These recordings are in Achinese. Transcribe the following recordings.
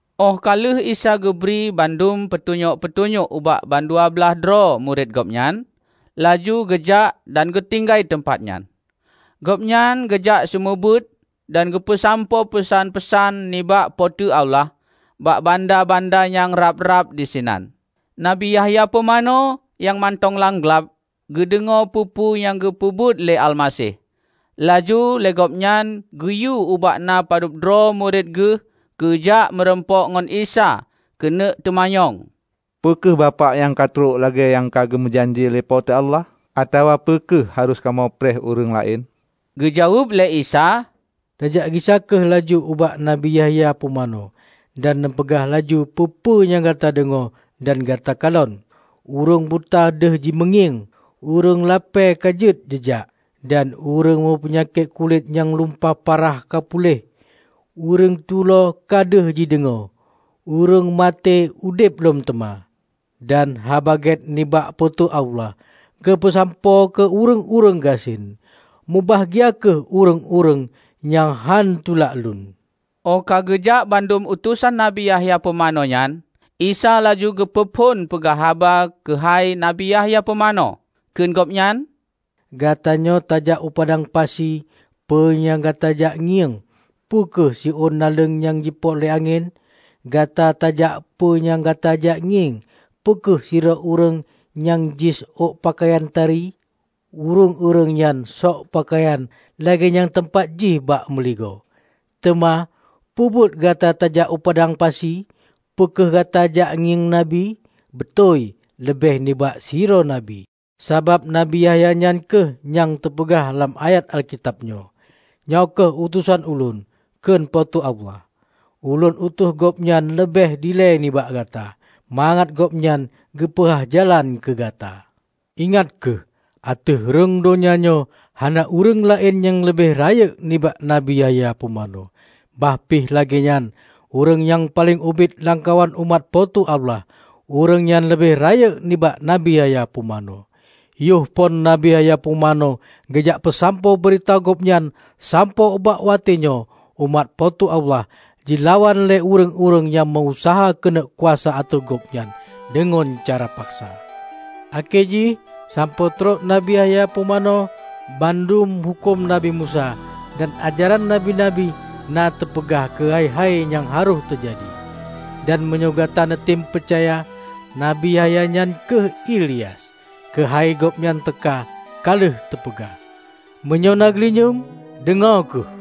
Óh ka lheueh Isa geubri bandum peutunyok-peutunyok ubak bandua blaih droe murit Gobnyan, laju geujak dan geutinggai teumpat nyan. Gobnyan geujak seumeubeuet dan geupeusampoe peusan-peusan nibak Po teu Allah bak banda-banda nyang rab-rab disinan. Nabi Yahya Pumanö nyang mantong lam glab geudeungoe peue-peue nyang geupeubuet lé Almaseh. Laju lé gobnyan geuyue ubak na padub droe murit geuh keujak meurumpok ngon Isa keuneuk teumanyong, "Peu kheueh Bapak nyang trok lagée nyang ka geumeujanji lé Po teu Allah, atawa peu kheueh harôh kamoe preh ureuëng laén?" Geujaweueb lé Isa, "Neujak gisa kheueh laju ubak Nabi Yahya Pumanö dan neupeugah laju peue-peue nyang gata deungoe dan gata kalon: Ureuëng buta deuh jimeungieng, ureuëng lapée ka jeuet jijak, dan ureuëng meupeunyakét kulét nyang lumpah parah ka puléh; ureuëng tuloe ka deuh jideungoe, ureuëng maté udeb lom teuma, dan Haba Gét nibak Po teu Allah geupeusampoe keu ureuëng-ureuëng gasien. Mubahgia kheueh ureuëng nyang hán tulak Ulôn!" Óh ka geujak bandum utosan Nabi Yahya Pumanö nyan, Isa laju geupeu phon peugah haba keuhai Nabi Yahya Pumanö, kheun Gobnyan, "Gata nyoe tajak u padang pasi peue nyang gata jak ngieng? Peu kheueh siôn naleueng nyang jipoet lé angén? Gata tajak peue nyang gata jak ngieng? Peu kheueh sidroe ureuëng nyang jisök peukayan tari? Ureuëng-ureuëng nyang sök peukayan lagée nyan teumpat jih bak meuligoe! Teuma, peubuet gata tajak u padang pasi? Peu kheueh gata jak ngieng nabi? Beutôi, leubeh nibak sidroe nabi. Sabab Nabi Yahya nyan kheueh nyang teupeugah lam ayat Alkitab nyoe, 'Nyoe kheueh utosan Ulôn, kheun Po teu Allah, Ulôn utus gobnyan leubeh dilée nibak Gata mangat gobnyan geupeuhah jalan keu Gata.' Ingat kheueh! Ateueh rhueng donya nyoe hana ureuëng laén nyang leubeh rayeuk nibak Nabi Yahya Pumanö. Bah pih lagée nyan, ureuëng nyang paleng ubit lamkawan umat Po teu Allah ureuëng nyan leubeh rayeuk nibak Nabi Yahya Pumanö. Yoh phon Nabi Yahya Pumanö geujak peusampoe beurita gobnyan sampoe ubak watée nyoe, umat Po teu Allah jilawan lé ureuëng-ureuëng nyang meu-useuha keuneuk kuasa ateueh gobnyan deungon cara paksa. Akhé jih sampoe trok Nabi Yahya Pumanö, bandum huköm Nabi Musa dan ajaran nabi-nabi na teupeugah keuhai-hai nyang harôh teujadi. Dan meunyoe gata neutem peucaya, nabi Yahya nyan kheueh Ilyas, keuhai gobnyan teuka ka lheueh teupeugah. Meunyoe na geulinyueng, deungoe kheueh!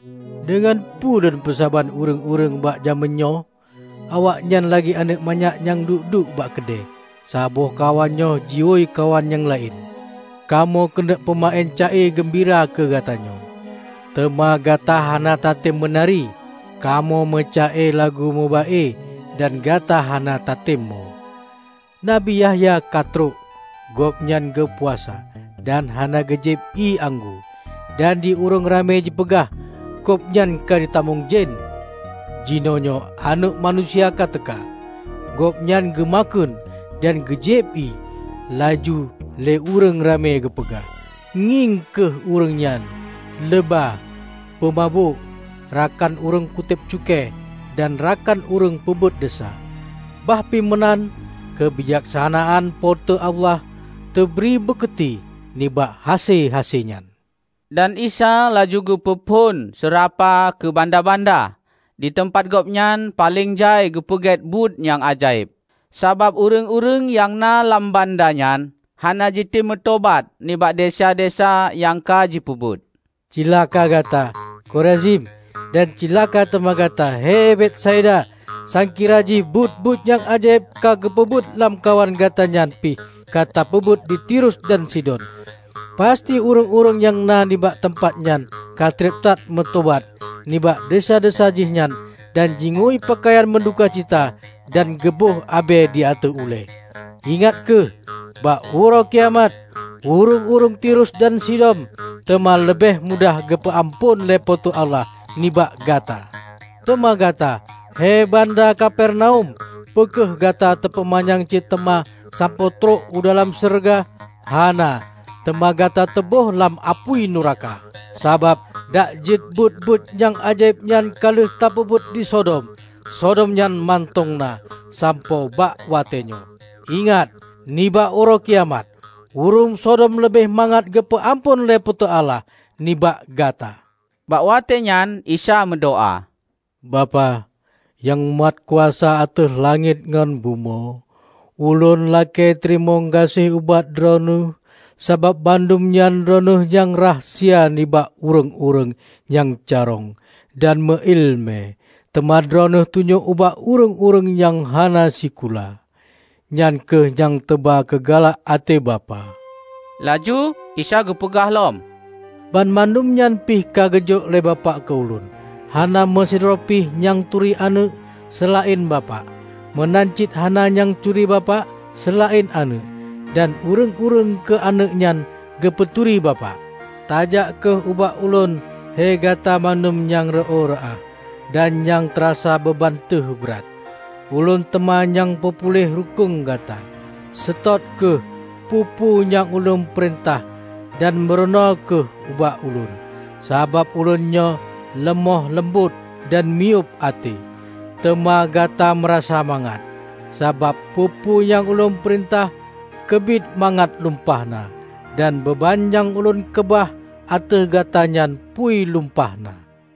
Deungon peue Lôn peusaban ureuëng-ureuëng bak jamén nyoe? Awaknyan lagée aneuëk manyak nyang duek-duek bak keude. Saboh kawan nyoe jihôi kawan nyang laén, 'Kamoe keuneuk peumeuén ca-e geumbira keu gata nyoe, teuma gata hana tatem meunari! Kamoe meuca-e lagu meuba-e, dan gata hana tatem mo!' Nabi Yahya ka trok -- gobnyan geupuasa dan hana geujieb ié anggô; dan di ureuëng ramé jipeugah, 'Gobnyan ka jitamong jén!' Jinoenyoe Aneuëk Manusia, ka teuka -- Gobnyan geu makheun dan geujieb ié; laju lé ureuëng ramé geupeugah, 'Ngieng kheueh ureuëng nyan! Leuba, peumabök, rakan ureuëng kutéb cukée dan rakan ureuëng peubuet desya.' Bah pih meunan, keubijaksanaan Po teu Allah teubri bukeuti nibak hase-hase nyan." Dan Isa laju geupeu phon seurapa keu banda-banda, di teumpat Gobnyan paleng jai geupeugét buet nyang ajaéb. Sabab ureuëng-ureuëng nyang na lam banda nyan hana jitem meutobat nibak desya-desya nyang ka jipeubuet. "Cilaka gata, Korazim! Dan cilaka teuma gata, he Betsaida! Sangkira jih buet-buet nyang ajaéb ka geupeubuet lamkawan gata nyan pih ka teupeubuet di Tirus dan Sidon, pasti ureuëng-ureuëng nyang na nibak teumpat nyan ka treb that meutobat nibak desya-desya jihnyan dan jingui peukayan meuduka cita dan geuboh abée di ateueh ulée. Ingat kheueh, bak Uroe Kiamat, ureuëng-ureuëng Tirus dan Sidon teuma leubeh mudah geupeu-amphon lé Po teu Allah nibak gata! Teuma gata, hé banda Kapernaum! Peu kheueh gata teupeumanyang cit teuma sampoe trok u dalam syeuruga? Hana! Teuma gata teuböh lam apui nuraka! Sabab dak jeuet buet-buet nyang ajaéb nyan ka lheueh teupeubuet di Sodom, Sodom nyan mantong na sampoe bak watée nyoe! Ingat, nibak Uroe Kiamat, ureuëng Sodom leubeh mangat geupeu-amphon lé Po teu Allah nibak gata!" Bak watée nyan Isa meudoá, "Bapak, nyang mat kuasa ateueh langét ngon bumoe! Ulôn lakée teurimong gaséh ubak Droeneueh sabab bandum nyan Droeneueh nyang rahsia nibak ureuëng-ureuëng nyang carông dan meu-iéleumé, teuma Droeneueh tunyok ubak ureuëng-ureuëng nyang hana sikula. Nyan kheueh nyang teuba keu galak até Bapak." Laju Isa geupeugah lom, "Banmandum nyan pih ka geujok lé Bapak keu Ulôn. Hana meusidroe pih nyang turi Aneuëk, seulaén Bapak. Meunan cit hana nyang turi Bapak seulaén Aneuëk, dan ureuëng-ureuëng keu Aneuëk nyan geupeuturi Bapak. Tajak kheueh ubak Ulôn he gata bandum nyang reuôh reuah, dan nyang teurasa beuban teuh brat; Ulôn teuma nyang peupuih rukueng gata. Seutôt kheueh peue-peue nyang Ulôn peurintah dan meurunoe kheueh ubak Ulôn. Sabab Ulôn nyoe leumoh leumbot dan miyueb até, teuma gata meurasa mangat. Sabab peue-peue nyang Ulôn peurintah keubiet mangat lumpah na, dan beuban nyang Ulôn keubah ateueh gata nyan phui lumpah na."